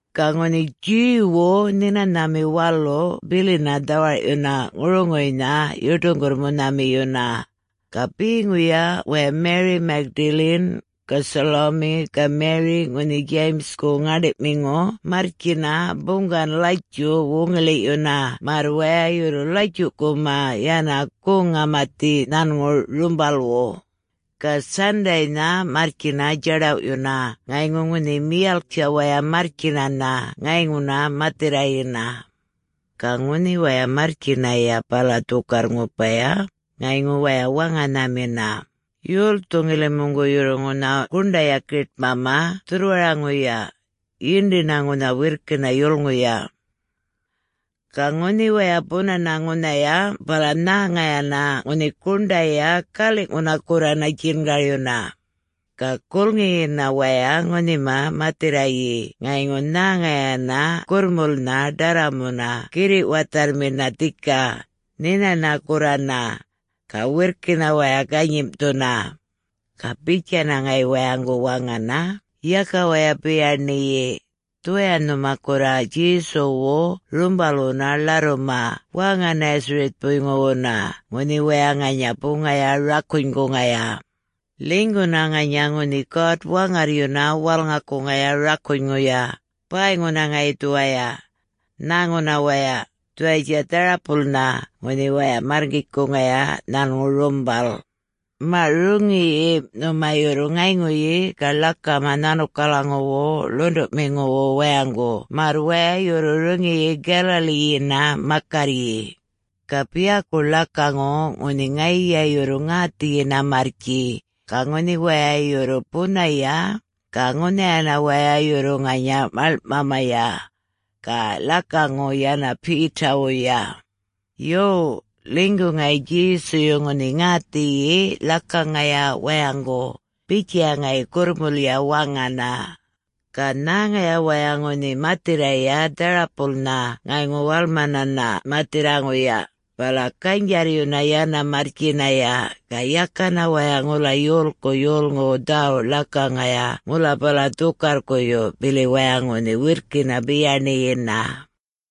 Ga ŋunhi Jew-wu Nhinanhami Walu bilina dhawarꞌyuna ŋuruŋuynha yuṯuŋgurr-munhamiyuna. Ga beŋuya waya Mary Magdalene, ga Salome, ga Mary ŋunhi James-ku ŋäṉḏiꞌmiŋu marrtjina buŋgan-latjuꞌ wuŋiḻiꞌyuna märr waya yurru latjuꞌkuma yana goŋ-ŋamathi nhanŋu rumbalwu. Ga Sunday-na marrtjina djaḏawꞌyuna, ŋayŋu ŋunhi miyalk-tja waya marrtjinana ŋayŋuna mathirrayina. Ga ŋunhi waya marrtjinaya bala dhukarr-ŋupaya, ŋayŋu waya waŋanhamina, “Yolthu ŋilimuŋgu yurru ŋunha guṉḏaya giṯmama dhurrwaraŋuya? Yindina ŋunha wirrkina yulŋuya.” Ga ŋunhi waya bunana ŋunhaya bala nhäŋayana ŋunhi guṉḏaya, galiꞌŋuna gurrana djingaryuna. Ga gulŋiyina waya ŋunhima mathirrayi ŋayŋu nhäŋayana gurrmulnha ḏarramuna girriꞌ watharrmina dhika, nhinana gurrana. Ga wirrkina waya ganyimꞌthuna. Ga bitjana ŋayi wayaŋgu waŋana, “Yaka waya biyaṉiyi. Dhuwaya nhuma gurra Djesuwu rumbalwuna ḻarruma wäŋa-Nazareth-puyŋuwuna ŋunhi waya ŋanya buŋaya rakunyguŋaya. Ḻinyguna ŋanya ŋunhi God-Waŋarryuna walŋakuŋaya rakunyŋuya, bäyŋuna ŋayi dhuwaya. Nhäŋuna waya, dhuwayatja dharapulnha ŋunhi waya märrkitjkuŋaya nhanŋu rumbal. Maꞌ, roŋiyi nhuma yurru ŋayŋuyi ga ḻakama nhanukalaŋuwu ḻuṉḏuꞌmiŋuwu wayaŋgu märr waya yurru roŋiyi Galilee-yina makarryi. Ga biyaku ḻakaŋu ŋunhi ŋayiya yurru ŋäthiyina marrtji, ga ŋunhi waya yurru bunaya, ga ŋunhayana waya yurru ŋanya maḻŋꞌmamaya. Ga ḻakaŋu yana Peter-wuya. Yo, ḻinygu ŋayi Djesuyu ŋunhi ŋäthiyi ḻakaŋaya wayaŋgu,” bitjaya ŋayi gurrmulya waŋana. Ga nhäŋaya waya ŋunhi mathirraya dharapulnha ŋayŋu walmanana mathirraŋuya, bala ganydjarryuna yana marrtjinaya. Ga yakana waya ŋula yolku yolŋuwu dhäwuꞌ ḻakaŋaya ŋula bala dhukarrkuyu bili waya ŋunhi wirrkina biyaṉiyina.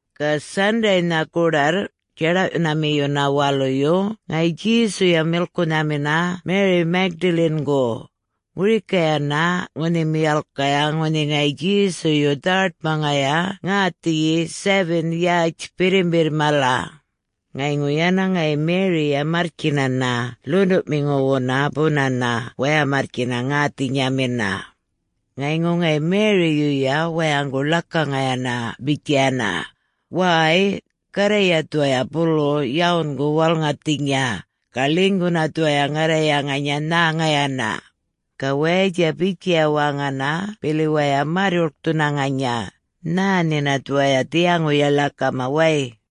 Ga Sunday-na goḏarr, djaḏawꞌyunamiyuna waluyu ŋayi Djesuya milkunhamina Mary Magdalene-gu. Ŋurikayana ŋunhi miyalkaya ŋunhi ŋayi Djesuyu dhawaṯmaŋaya ŋäthiyi seven yätj birrimbirr mala. Ŋayŋu yana ŋayi Mary-ya marrtjinana ḻuṉḏuꞌmiŋuwuna bunana, waya marrtjina ŋäthinyamina. Ŋayŋu ŋayi Mary-yuya wayaŋgu ḻakaŋayana bitjayana, “Wäy, Garrayya dhuwaya bulu yawungu walŋathinya, ga ḻinyguna dhuwaya ŋarraya ŋanya nhäŋayana.” Ga wayatja bitjaya waŋana bili waya märr-yuḻkthuna ŋanya, “Nhä nhina dhuwaya dhiyaŋuya ḻakama way!”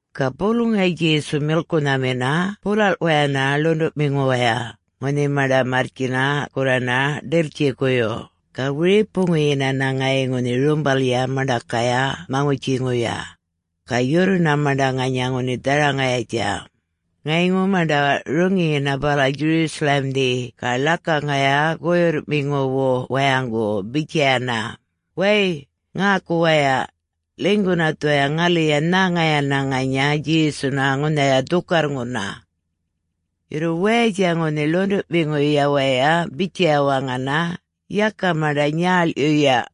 Ga bulu ŋayi Djesu milkunhamina bulalꞌwayana ḻuṉḏuꞌmiŋuwaya, ŋunhi maṉḏa marrtjina gurrana ḏiltjikuyu. Ga wiripuŋuyinana ŋayi ŋunhi rumbalya maṉḏakaya maŋutjiŋuya. Ga yurruna, maṉḏa ŋanya ŋunhi dharaŋayatja. Ŋayŋu maṉḏa roŋiyina bala Jerusalem-dhi ga ḻakaŋaya guyurrꞌmiŋuwu wayaŋgu bitjayana, “Way, ŋäku waya! Ḻinyguna dhuwaya ŋaliya nhäŋayana ŋanya Djesuna ŋunhaya dhukarrŋuna!” Yurru wayatja ŋunhi ḻuṉḏuꞌmiŋuya waya bitjaya waŋana, “Yaka maṉḏa nyäḻꞌyuya.”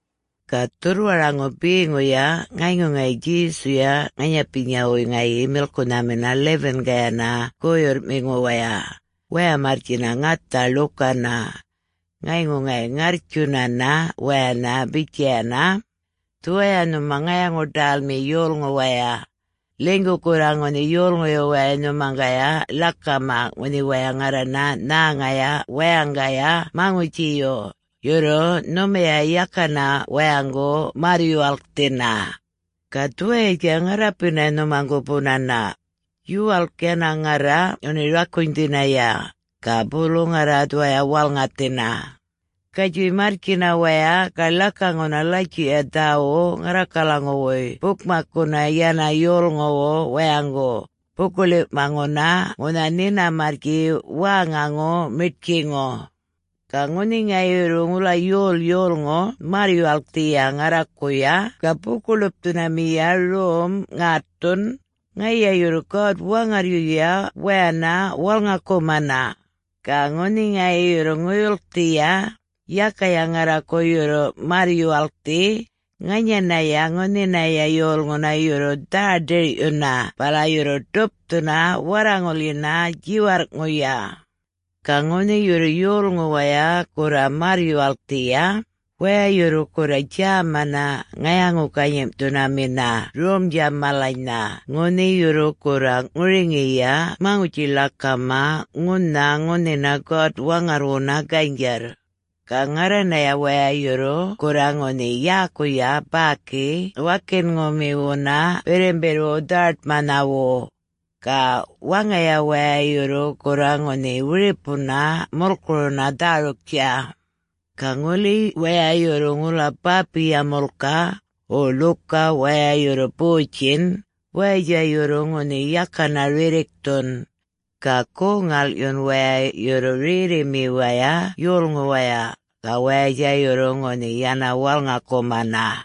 Ga dhurrwaraŋu beŋuya ŋayŋu ŋayi Djesuya ŋanyapinyawuy ŋayi milkunhamina 11-kayana guyurrꞌmiŋuwaya, waya marrtjina ŋatha ḻukana. Ŋayŋu ŋayi ŋarrtjunana wayana bitjayana, “Dhuwaya nhuma ŋayaŋu-ḏälmi yolŋu waya. Ḻinygu gurra ŋunhi yolŋuyu wayay nhumaŋgaya ḻakama ŋunhi waya ŋarrana nhäŋaya wayaŋgaya maŋutjiyu, yurru nhumaya yakana wayaŋgu märr-yuwalkthina. Ga dhuwayatja ŋarrapina nhumaŋgu bunana. Yuwalk yana ŋarra ŋunhi rakunydhinaya, ga bulu ŋarra dhuwaya walŋathina. Gatjuy marrtjina waya ga ḻakaŋuna latjuꞌya dhäwuꞌ ŋarrakalaŋuwuy bukmakkuna yana yolŋuwu wayaŋgu, buku-ḻiwꞌmaŋuna ŋunha nhina marrtji wäŋaŋu miṯtjiŋu. Ga ŋunhi ŋayi yurru ŋula yol yolŋu märr-yuwalkthiya ŋarrakuya, ga buku-ḻupthunamiya rom ŋätthun, ŋayiya yurru God-Waŋarryuya wayana walŋakumana. Ga ŋunhi ŋayi yurru ŋuyulkthiya, yakaya ŋarraku yurru märr-yuwalkthi, ŋanyanaya ŋunhinaya yolŋuna yurru dhä-ḏirꞌyuna bala yurru ḏupthuna warraŋulyina djiwarrꞌŋuya. Ga ŋunhi yurru yolŋu waya gurra märr-yuwalkthiya, waya yurru gurra djämana ŋayaŋu-ganyimꞌthunamina romdja malanynha ŋunhi yurru gurra ŋuriŋiya maŋutji-ḻakama ŋunha ŋunhina God-Waŋarrwuna ganydjarr. Ga ŋarranaya waya yurru gurra ŋunhi yäkuya bäki wakinŋumiwuna birrimbirrwu dhawaṯmanhawu. Ga waŋaya waya yurru gurra ŋunhi wiripuna mulkuruna dhäruktja. Ga ŋuli waya yurru ŋula bäpiya mulkaꞌ, wo ḻuka waya yurru botjinꞌ, wayatja yurru ŋunhi yakana rirrikthun. Ga goŋ-ŋalꞌyun waya yurru rerrimiwaya yolŋuwaya, ga wayatja yurru ŋunhi yana walŋakumana.”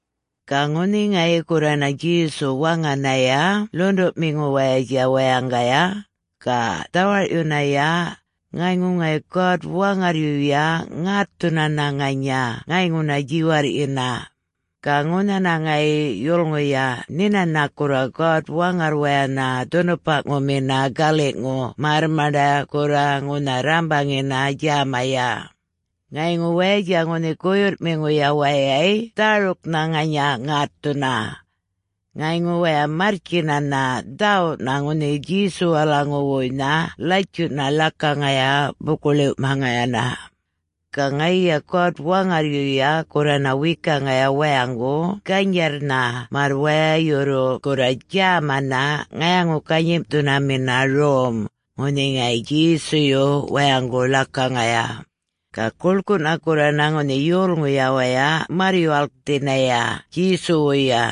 Ga ŋunhi ŋayi gurrana Djesu waŋanaya ḻuṉḏuꞌmiŋuwayatja wayaŋgaya, ga dhawarꞌyunaya, ŋayŋu ŋayi God-Waŋarryuya ŋätthunana ŋanya ŋayŋuna djiwarrꞌyina. Ga ŋunhana ŋayi yulŋuya nhinana gurra God-Waŋarrwayana dhunupamiŋuna galiꞌŋu, märr maṉḏa gurra ŋunha rrambaŋina djämaya. Ŋayŋu wayatja ŋunhi guyurrꞌmiŋuya wayay dhäruknha ŋanya ŋätthuna. Ŋayŋu waya marrtjinana dhäwuꞌna ŋunhi Djesuwalaŋuwuynha latjuꞌna ḻakaŋaya buku-ḻiwꞌmaŋayana. Ga ŋayiya God-Waŋarryuya gurrana wekaŋaya wayaŋgu ganydjarrnha märr waya yurru gurra djämana ŋayaŋu-ganyimꞌthunamina rom, ŋunhi ŋayi Djesuyu wayaŋgu ḻakaŋaya. Ga guḻkuꞌna gurrana ŋunhi yolŋuya waya märr-yuwalkthinaya Djesuwuya,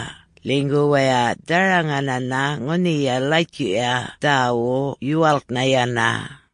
ḻinygu waya dharaŋanana ŋunhiya Latjuꞌya Dhäwuꞌ yuwalknha yana.